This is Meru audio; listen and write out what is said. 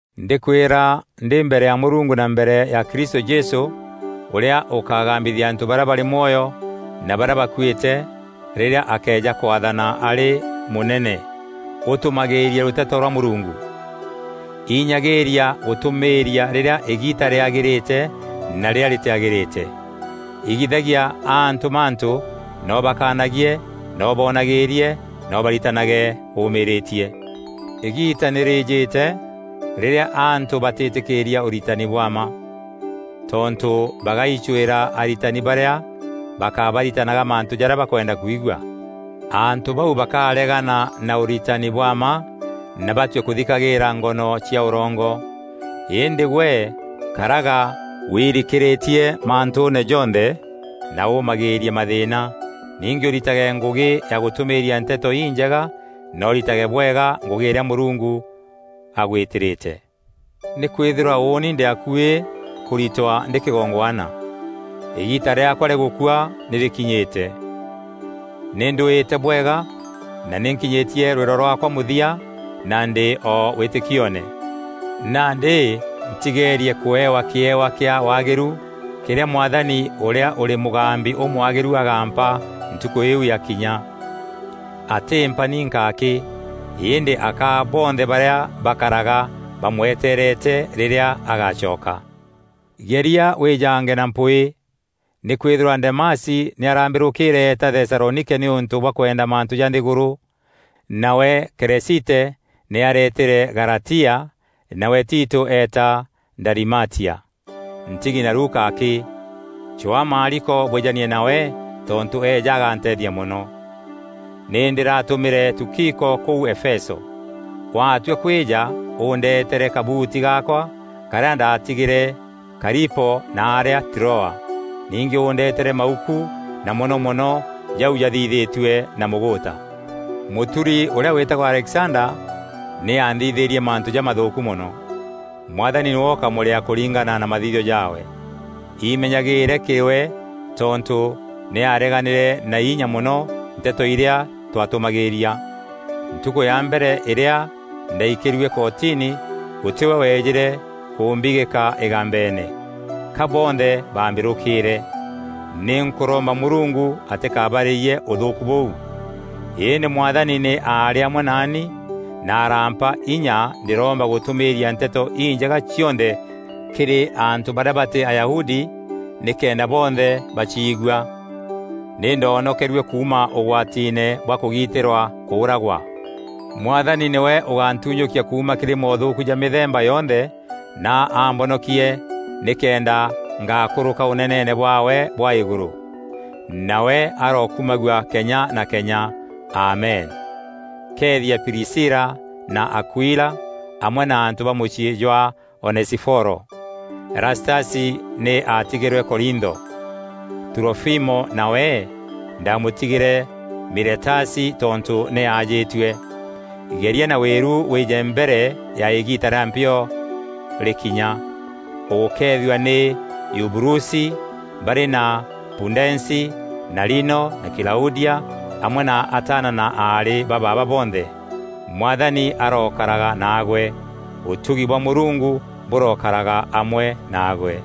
Ndîkwîra ndî mbere ya Mûrungu na mbere ya Kristû Jesû ûrîa ûkagambithia antû barîa barî mwoyo na barîa bakuîte rîrîa akeeja kwaathana arî mûnene, ûtûmagîîrie rûteto rwa Mûrungu. Inyagîîria gûtûmîîria rîrîa îgiita rîagîrîte na rîrîa rîtîagîrîte. Igithagia antû mantû na ûbakanagie na ûboonagîîrie na ûbaritanage ûmîrîtie. Îgiita nî rîîjîte rîrîa antû batîtîkîîria ûritani bwa mma. Tontû bagaicwîra aritani barîa bakabaritanaga mantû jarîa bakwenda kwigua. Antû bau bakaregana na ûritani bwa mma na batue kûthikagîîra ngono cia ûrongo. Îndî gwe karaga wirikîrîtie mantûûne jonthe na ûmagîîrie mathîîna. Ningî ûritage ngûgî ya gûtûmîîria Nteto Injega na ûritage bwega ngûgî îrîa Mûrungu agwîtîrîte. Nîkwîthîrwa ûûni ndî akuî kûritwa ndî kîgongwana. Îgiita rîaakwa rîa gûkua nî rîkinyîte. Nî ndwîte bwega na nî nkinyîtie rwîro rwaakwa mûthia na ndî o wîtîkioone. Nandî ntigeerie kûewa kîewa kîa waagîru kîrîa Mwathani, ûrîa ûrî mûgambi ûmwagîru agaampa Ntukû iu yakinya. Atîmpa ninka akî, îndî akaa bonthe barîa bakaraga bamweteerete rîrîa agacoka. Geria wîjange na mpwîî. Nîkwîthîrwa Demasi nî arambîrûkîîre eeta Thesalonike nîûntû bwa kwenda mantû ja nthîgûrû. Nawe Keresite nî areetîre Galatia, nawe Tito eeta Dalimatia. Ntigi na Luka akî. Cwaa Maariko bwîjanie nawe tontû eeja aganteethia mono. Nî ndîratûmîre Tukiko kûu Efeso. Watua kwîja ûndeeteere kabuuti gaakwa karîa ndaatigîîre Karipo naarîa Troa. Ningî ûndetere mauku na mono mono jau jathithîtue na mûgûûta. Mûturi ûrîa wîtagwa Alexanda nî anthithîîrie mantû jamathûûku mono. Mwathani nîwe ûkamûrîaa kûringana na mathithio jaawe. Imenyagîîre kîrî we tontû nî aareganîre na inya mono nteto irîa twatûmagîîria. Ntukû ya mbere îrîa ndaikîrue kotini, gûtî we weejîre kûmbigîka îgambeene, ka bonthe baambîrûkîîre. Nî nkûromba Mûrungu atîkabarîyie ûthûûku bûu! Îndî Mwathani nî aarî amwe naani na araampa inya ndîroomba gûtûmîîria Nteto Injega cionthe kîrî antû barîa batî Ayahudi nîkenda bonthe baciigua. Nî ndoonokerue kuuma ûgwatiine bwa kûgitîrwa kûragwa. Mwathani nîwe ûgantunyûkia kuuma kîrî moothûûku ja mîthemba yonthe na ambonokie nîkenda ngakûrûka Ûneneene bwaawe bwa Îgûrû. Nawe arokumagua kenya na kenya. Amen. Keethia Prisila na Akuila, amwe na antû ba mûciî jwa Onesiforo. Erastasi nî aatigîrwe Korintho. Turofimo nawe ndamûtigîre Miletasi tontû nî aajîtue. Geria na wîru wîje mbere ya îgiita rîa mpio rîkinya. Ûgûkeethua nî Eubulusi barî na Pudensi na Lino na Klaudia amwe na ataana na aarî ba baaba bonthe. Mwathani arokaraga naagwe. Ûtugi bwa Mûrungu bûrokaraga amwe naagwe.